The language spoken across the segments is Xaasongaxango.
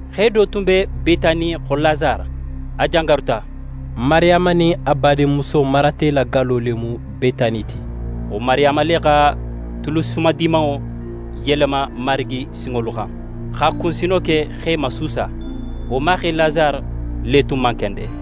Xe do tun be Betani xo Lasare, a jangaruta. Mariyama nin a badinmuso Marate la gallo le mu Betani ti. Wo Mariyama le xa tulu sumadimanŋo yelema Marigi sinŋolu xan, x'a kunsino ke, x'e masuusa. Wo maxe Lasare le tun man kende.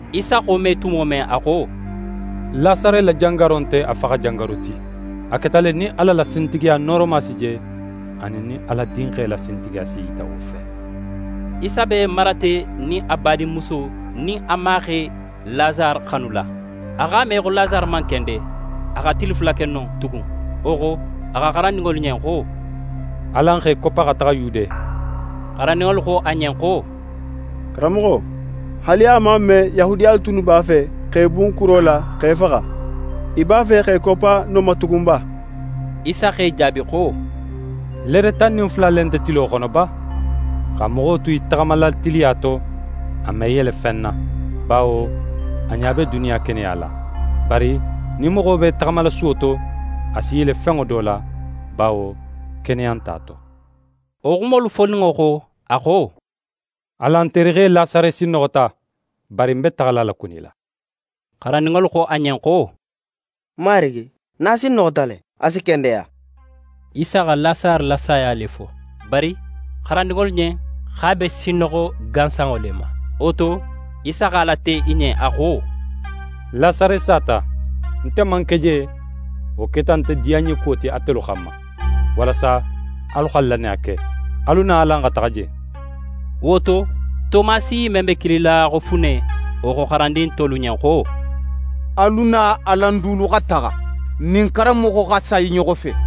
Isa xa wo me tumo men, a xo: «Lasare la jangaro nte a faxajangaru ti. A keta le nin Ala la sintigiya nooroma si je, anin nin Ala Dinxe la sintigiya si yita wo fe.» Isa be Marate nin a badinmuso nin a maxe Lasare xanula. A x'a me, xo Lasare man kende. A xa tili fula ke non tugun. Wo xo, a xo xarandinŋolu ɲen xo: «Alan x'e koppa, xa taxa Yude.» Xarandinŋolu xo a ɲen xo: «Karanmoxo, haali a man me, Yahudiyalu tunnu b'a fe, x'é bun kuro la, x'é faxa. Í b'a fe x'é koppa non ma tugun ba?» Isa x'e jaabi xo: «Leere tan nin fula le nte tilo xono ba? Xa moxo tu í taxamala tiliya to, a me yele fen na, bawo a ɲa be duniya keneya la. Bari nin moxo b'é taxamala suwo to, a si yele fenŋo do la, bawo keneya nt'a to.» Wo xumolu foninŋo xo, a xo: «Alan terixe Lasare sinnoxota. Bari ń be taxala a lakunila.» Xarandinŋolu xo a ɲen xo: «Marigi, nin a sinnoxota le, a si kendeya.» Isa xa Lasare la saya le fo. Bari xarandinŋolu ɲen, x'a be sinnoxo gansanŋo le ma. Wo to, Isa x'a late i ɲen, a xo: «Lasare sata. Nte man ke je, wo keta nte diyanɲekuwo ti atelu xanma, walasa alu xa lannaya ke. Alu na alan xa taxa je.» Wo to, Tomasi men be kilila xo Fune, wo xo xarandin tolu ɲen xo: «Alu na alan dulu xa taxa, n nin karanmoxo xa sa i ɲoxo fe.»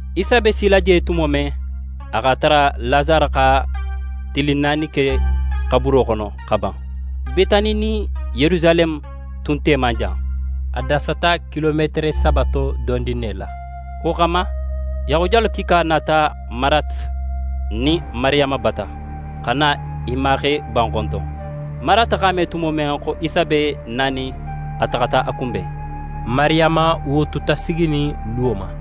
Isa be sila je tumo men, a x'a tara Lasare xa tili naani ke xaburo xono xa ban. Betani nin Yerusaleme tun te man jan. A dasata kilometere saba to dondin ne la. Wo xanma, Yahudiyalu kiika nata Marate nin Mariyama bata, xa na i maxe banxonton. Marate x'a me tumo men xo Isa be nanin, a taxata a kunben. Mariyama, wo tuta siginin luwo ma.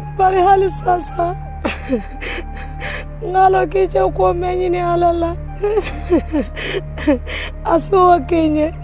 Bari haali saasa, ń x'a lon xo í je kuwo men ŋinin Ala la, a si wo ke í ɲen.»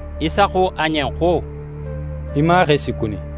Isa xo a ɲen xo: «Í maxe si kuni.»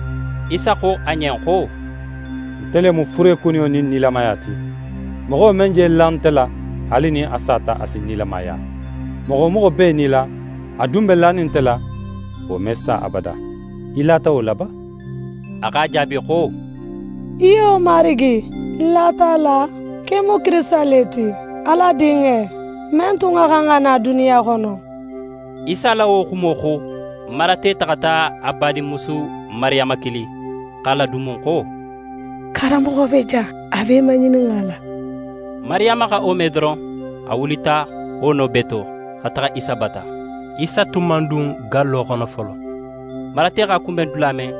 Isa xo a ɲen xo: «Nte le mu furekuniyo nin nilamaya ti. Moxo men je la nte la, haali nin a sata a si nilamaya. Moxo wo moxo be í nila, a dun be lanin nte la, wo me sa abada. Í lata wo la ba?» A x'a jaabi xo: «Iyo, Marigi, ń lata a la, xo í mu Kirisita le ti, Ala Dinxe, men tun xa xan xa na duniya xono.» Isa la wo xumo xo, Marate taxata a badinmusu Mariyama kili x'a ladunmun xo: «Karanmoxo be jan, a b'é maŋininxala.» Mariyama xa wo me doron, a wulita wo no bee to, xa taxa Isa bata. Isa tun man dun gallo xono folo. Marate x'a kunben dula men,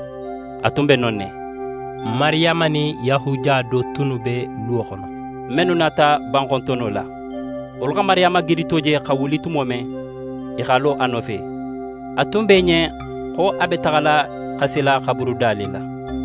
a tun be non ne. Mariyama nin Yahudiya do tunnu be luwo xono, mennu nata banxontonno la. Wolu xa Mariyama gidito je xa wuli tumo men, i x'a lo a nofe. A tun be i ɲen xo a be taxala xasila xaburuda le la.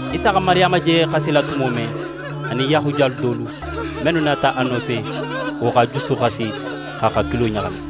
Isa xa Mariyama je xasila tumo men, a nin Yahudiya dulu, mennu nata a nofe, wo x'a juso xasi, x'a hakilo ɲaxami.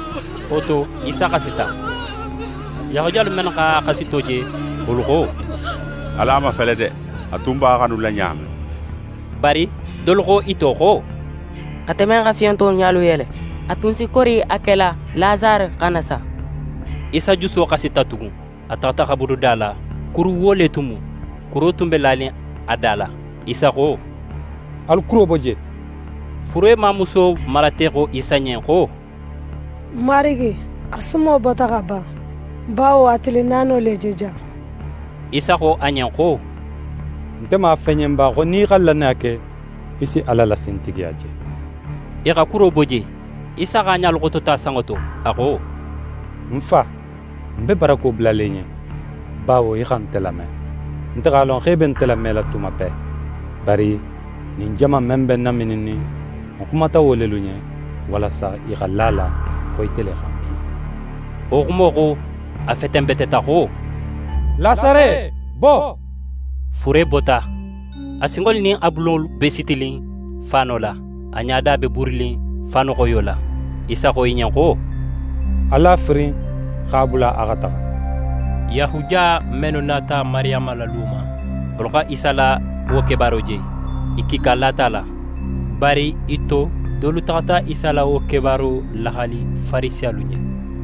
Wo to, Isa xasita. Yahudiyalu mennu x'a xasito je, wolu xo: «Alu a mafele de! A tun b'a xanula ɲa men.» Bari dolu xo i to xo: «Ate men xa fiyonto ɲalu yele, a tun si kori a kela Lasare xana sa?» Isa juso xasita tugun. A taxata xaburuda la. Kuruwuwo le tun mu. Kuro tun be lanin a da la. Isa xo: «Alu kuro bo je!» Fure mamusuwo Marate xo Isa ɲen xo: «Marigi, a sumo bota xa ban, bawo a tili naano le je jan.» Isa xo a ɲen xo: «Nte man a fo í ɲen ba, xo nin í xa lannaya ke, í si Ala la sintigiya je?» I xa kuro bo je. Isa x'a ɲalu xotota sanŋo to. A xo: «Ń Fa, ń be barako bulala í ɲen, bawo í xa nte lame. Nte x'a lon xo í be nte lamela tuma bee. Bari ɲin jama in men be ń namininnin, ń xumata wo lelu ɲen, walasa i xa la a la, xo ite le xa ń ki.» Wo xumo xo, a fetenbeteta xo: «Lasare, bo!» Fure bota, a sinŋolu nin a bulolu be sitinin faano la, a ɲada be buurinin faanuxoyo la. Isa xo i ɲen xo: «Alu a firin, x'a bula a xa taxa.» Yahudiya mennu nata Mariyama la luwo ma, wolu xa Isa la wo kebaaro je. I kiika lata a la. Bari i to, dolu taxata Isa la wo kebaaro laxali Farisiyalu ɲen.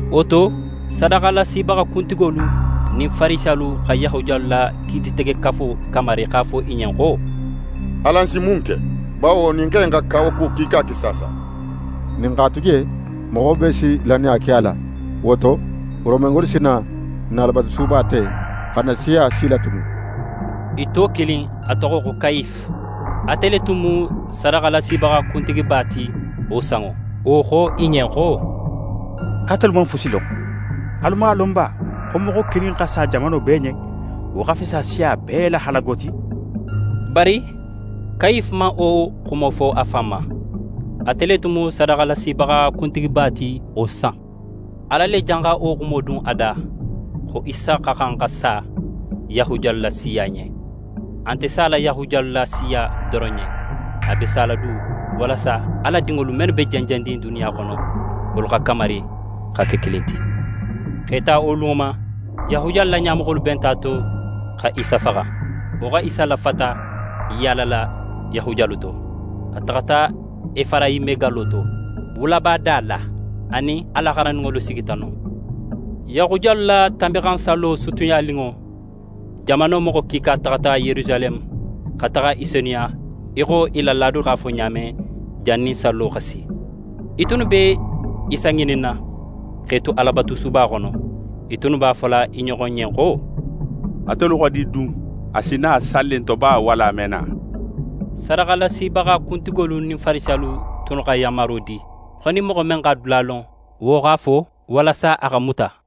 Wo to, sadaxalasibaxa kuntigolu nin Farisiyalu xa Yahudiyalu la Kiititegekafo kamari x'a fo i ɲen xo: «Alan si mun ke? Bawo ɲin xe in xa kawakuwo kiika ke saasa. Nin n x'a tu je, moxo bee si lannaya ke a la. Wo to, Romengolu si na n na Alabatusuba te, xa n na siya silatunu.» I to kilin, a toxo xo Kayife, ate le tun mu sadaxalasibaxa kuntigiba ti wo sanŋo. Wo xo i ɲen xo: «Atelu man fusi lon. Alu man a lon ba xo moxo kilin xa sa jamano bee ɲen, wo xa fisa siya bee la halago ti?» Bari Kayife man wo xumo fo a fan ma. Ate le tun mu sadaxalasibaxa kuntigiba ti wo san. Ala le janxa wo xumo dun a da, xo Isa xa xan xa sa Yahudiyalu la siya ɲen. A nte sala Yahudiyalu la siya doron ɲen. A be sala du, walasa Ala dinŋolu mennu be jenjennin duniya xono, wolu xa kamari, xa ke kilin ti. X'é ta wo lunŋo ma, Yahudiyalu la ɲamoxolu benta a to, xa Isa faxa. Wo xa Isa lafata í yaalala Yahudiyalu to. A taxata Efarayime gallo to, wulaba da la. A nin a la xarandinŋolu sigita non. Yahudiyalu la Tanbinxansallo sutiyaninŋo, jamano moxo kiika taxata Yerusaleme, xa taxa i senuya, í xo i la laado x'a fo ɲa men, jannin sallo xa si. I tunnu be Isa ŋininna. X'e tu Alabatusuba xono, i tunnu b'a fola i ɲoxo ɲen xo: «Atelu xo di dun? A si na salli in to ba, walla a me na?» Sadaxalasibaxa kuntigolu nin Farisiyalu tunnu xa yanmaro di, xo nin moxo men x'a dula lon, wo x'a fo; walasa a xa muta.